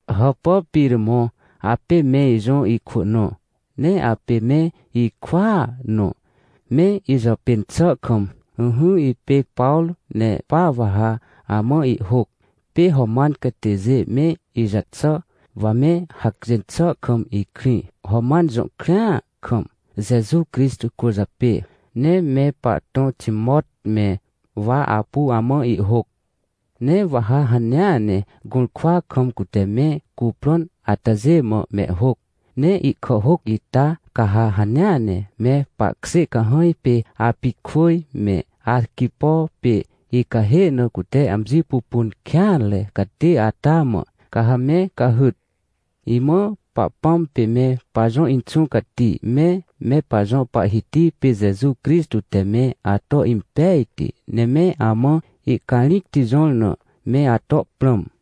Hàpà Piremõ, apê me ijõ ikwỳ nõ, ne apê me ikwỳa nõ, me ijàpên xà kam. Ỹhỹ, ipê Pawrô, ne pa wa ha amã ihhôc. Pê Roman catêjê me ijaxà, wa me hacjên xà kam ikrĩ, Roman jõ krĩa kam, Jeju Crixtô cwỳrjapê, ne me pahtõ Timot me, wa apu amã ihhôc. Ne wa ha hanea ne gũrkwa kam, cute me cuprõn atajê mã mehhôc. Ne ihkàhhôc ita, ca ha hanea ne me pahkjê cahãj pê Apijkwỳj me Arquipo pê icahê na cute amji pupun kêanre catê ata mã, ca ha me cahyt. Imã Pahpãm pê me pajõ Inxũ Cati me, me pajõ Pahhiti pê Jeju Crixtô te me ato impejti, ne me amã ihcarĩcti jõr na me ato prãm.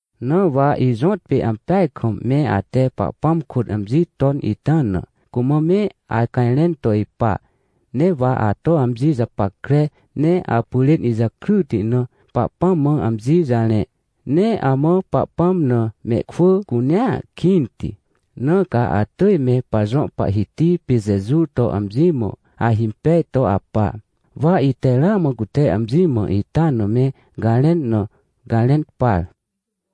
Na wa ijõtpê ampeaj kam, me ate Pahpãm kôt amji ton ita na, cumã me acajrẽn to ipa. Ne wa ato amji japackre, ne apyrên ijakryti na, Pahpãm mã amji jarẽ. Ne amã Pahpãm na mehkwỳ cunea kĩnti, na ca atỳj me pajõ Pahhiti pê Jeju to amji mã ahimpej to apa. Wa ite ramã cute amji mã ita na me garẽn na, garẽn par.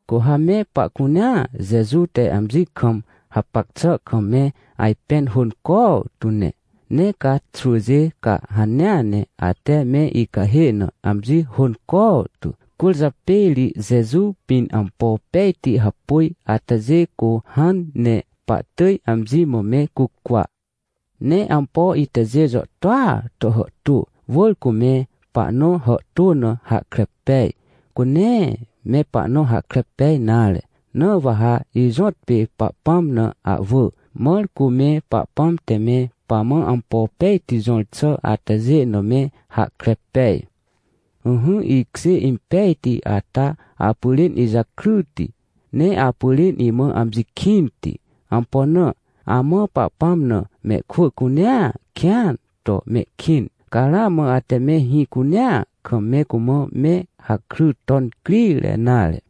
Cu ha me pahcunea Jeju te amji kam hapac xà kam me ajpẽn hônco tu ne. Ne ca xwỳjê, ca hanea ne, ate me icahê na amji hônco tu. Cwỳrjapê ri, Jeju pĩn ampo pejti hapôj atajê, cu hãn ne pahtỳj amji mã me cucwa. Ne ampo itajê jàhtôa to hàhtô, wỳr cu me pahnõ hàhtô na hahkre pej, cu nee me pahnõ hahkre pej nare. Na wa ha ijõtpê Pahpãm na ahwỳ, mãr cu me Pahpãm te me pamã ampo pejti jõr xà atajê na me hahkre pej. Ỹhỹ, ikjê impejti ata, apyrên ijakryti, ne apyrên imã amji kĩnti. Ampo na? Amã Pahpãm na mehkwỳ cunea kĩan to mehkĩn, ca ramã ate me hĩ cunea kam, me cumã me hakry ton crire nare.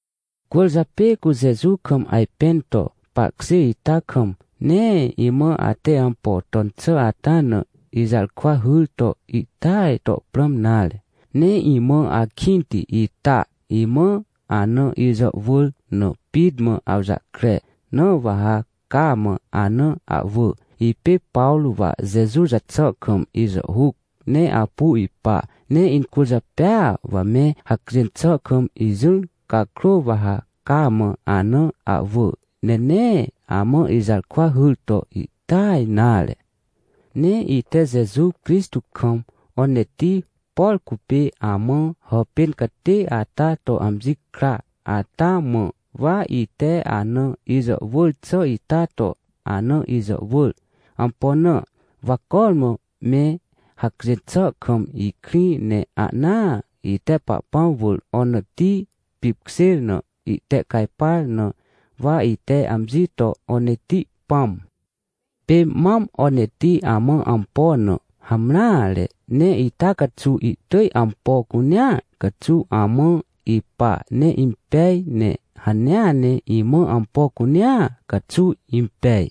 Cwỳrjapê cu Jeju kam ajpẽn to pahkjê ita kam, nee imã ate ampo ton xà ata na, ijarkwa hyr to ihtỳaj to prãm nare. Ne imã akĩnti ita, imã ana ijàhwỳr na pit mã awjahkre, na wa ha cama ana ahwỳ. Ipê Pawrô, wa Jeju jaxà kam ijàhhuc ne apu ipa, ne incwỳrjapêa wa me hacjên xà kam ijỹr cakrô, wa ha cama ana ahwỳ, ne nee amã ijarkwa hyr to ihtỳaj nare. Ne ite Jeju Crixtô kam Oneti, por cupê amã hàpên catê ata to amji kra ata mã wa ite ana ijàhwỳr xà ita to ana ijàhwỳr. Ampo na? Wa cormã me hacjên xà kam ikrĩ, ne ahnaa ite Pahpãm wỳr Oneti pipkjêr na ihtehcajpar, na wa ite amji to Oneti pãm. Pê mam Oneti amã ampo na hamreare, ne ita caxuw ihtỳj ampo cunea caxuw amã ipa ne impej, ne hanea ne imã ampo cunea caxuw impej.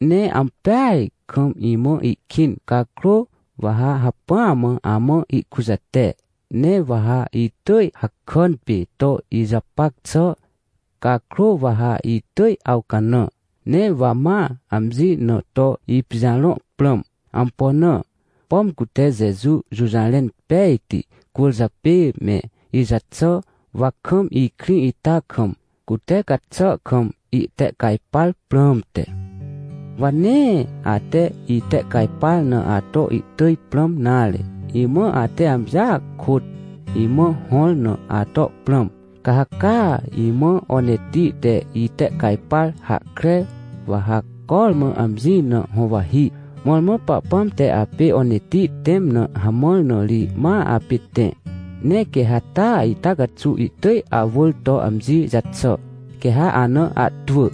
Ne ampeaj kam imã ihkĩn cakrô, wa ha hacpỹa mã amã ihkujate, ne wa ha itỳj hakàn pê to ijapac xà. Cakrô wa ha itỳj awcanã. Ne wa ma amji na to ipijarõ prãm. Ampo na? Pom cute Jeju jũjarẽn pejti cwỳrjapê me ijaxàr, wa kam ikrĩ ita kam, cute gaxà kam, itehcajpar prãmte. Wa nee ate itehcajpar na ato ihtỳj prãm nare. Imã ate amjia kôt imã hõr na ato prãm. Ca ha caa imã Oneti te itehcajpar hahkre, wa ha cormã amji na huwahi. Mõrmõ Pahpãm te apê Oneti tẽm na hamãr, na ri ma apê tẽ. Ne quê ha taa ita caxuw ihtỳj awỳr to amji jaxà, quê ha ana ahtwỳ.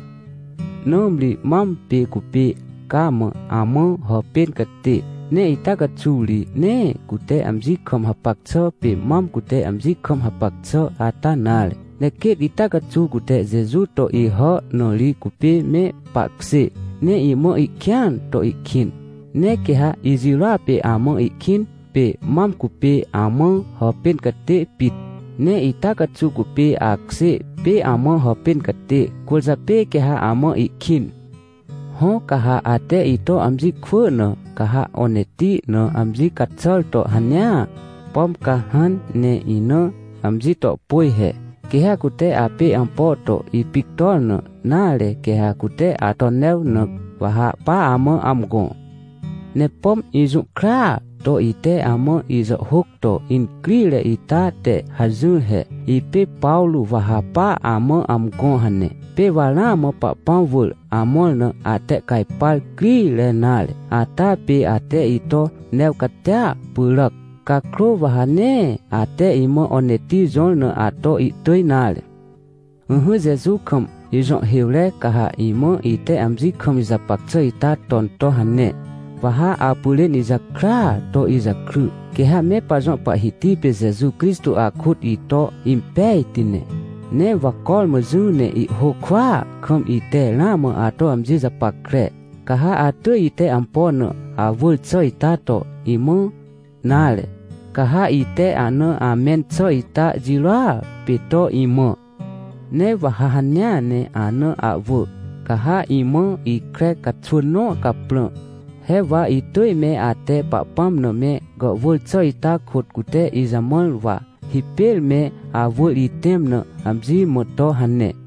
Nãmri mam pê cupê cama amã hàpên catê, ne ita caxuw ri, nee cute amji kam hapac xà pê mam cute amji kam hapac xà ata nare. Ne quêt ita caxuw cute Jeju to Ihà, na ri cupê me pahkjê. Ne imã ihkĩan to ihkĩn. Ne quê ha ijirôa pê amã ihkĩn, pê mam cupê amã hàpên catê pit, ne ita caxuw cupê akjê pê amã hàpên catê, cwỳrjapê quê ha amã ihkĩn. Hõ, ca ha ate ito amji kwỳ na, ca ha Oneti na amji caxàr to hanea, pom ca hãn ne ina amji to pôj he. Quê ha cute apê ampo to ipictor na, nare, quê ha cute ato new na, wa ha pa amã amgõ. Ne pom ijũhkraa to ite amã ijàhhôc to incrire ita te hajỹr he: “Ipê Pawrô, wa ha pa amã amgõ” hane. Pê wa ramã Pahpãm wỳr amõr na, atehcajpar crire nare, ata pê ate ito new catia pyràc. Cakrô, wa ha nee ate imã Oneti jõr na ato ihtỳj nare. Ỹhỹ Jeju kam jõhhêwre, ca ha imã ite amji kam ijapac xà ita ton to hane, wa ha apyrên ijakrya to ijakry, quê ha me pajõ Pahhiti pê Jeju Crixtô akôt ito impejti ne. Ne wa cormã jỹ ne ihhôc kwỳa kam, ite ramã ato amji japackre, ca ha atỳj ite ampo na awỳr xà ita to imã, nare, ca ha ite ahna amẽn xà ita jirôa pê to imã. Ne wa ha hanea ne ana ahwỳ, ca ha imã ikre caxwỳn nõ caprã, he wa itỳj me ate Pahpãm na me gàhwỳr xà ita kôt cute ijamãr, wa hipêr me awỳr itẽm na amji mã to hane.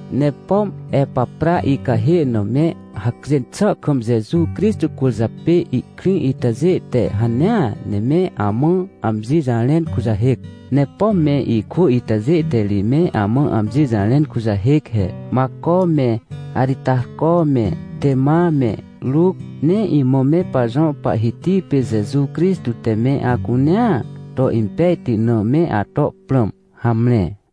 Ne pom Epapra icahê na me hacjên xà kam Jeju Crixtô cwỳrjapê ihkrĩ itajê te hanea ne me amã amji jarẽn kujahêc. Ne pom me ikwỳ itajê te ri me amã amji jarẽn kujahêc he: Macô me, Aritarcô me, Tema me Ruc. Ne imã me pajõ Pahhiti pê Jeju Crixtô te me acunea to impejti na me ato prãm. Hamre.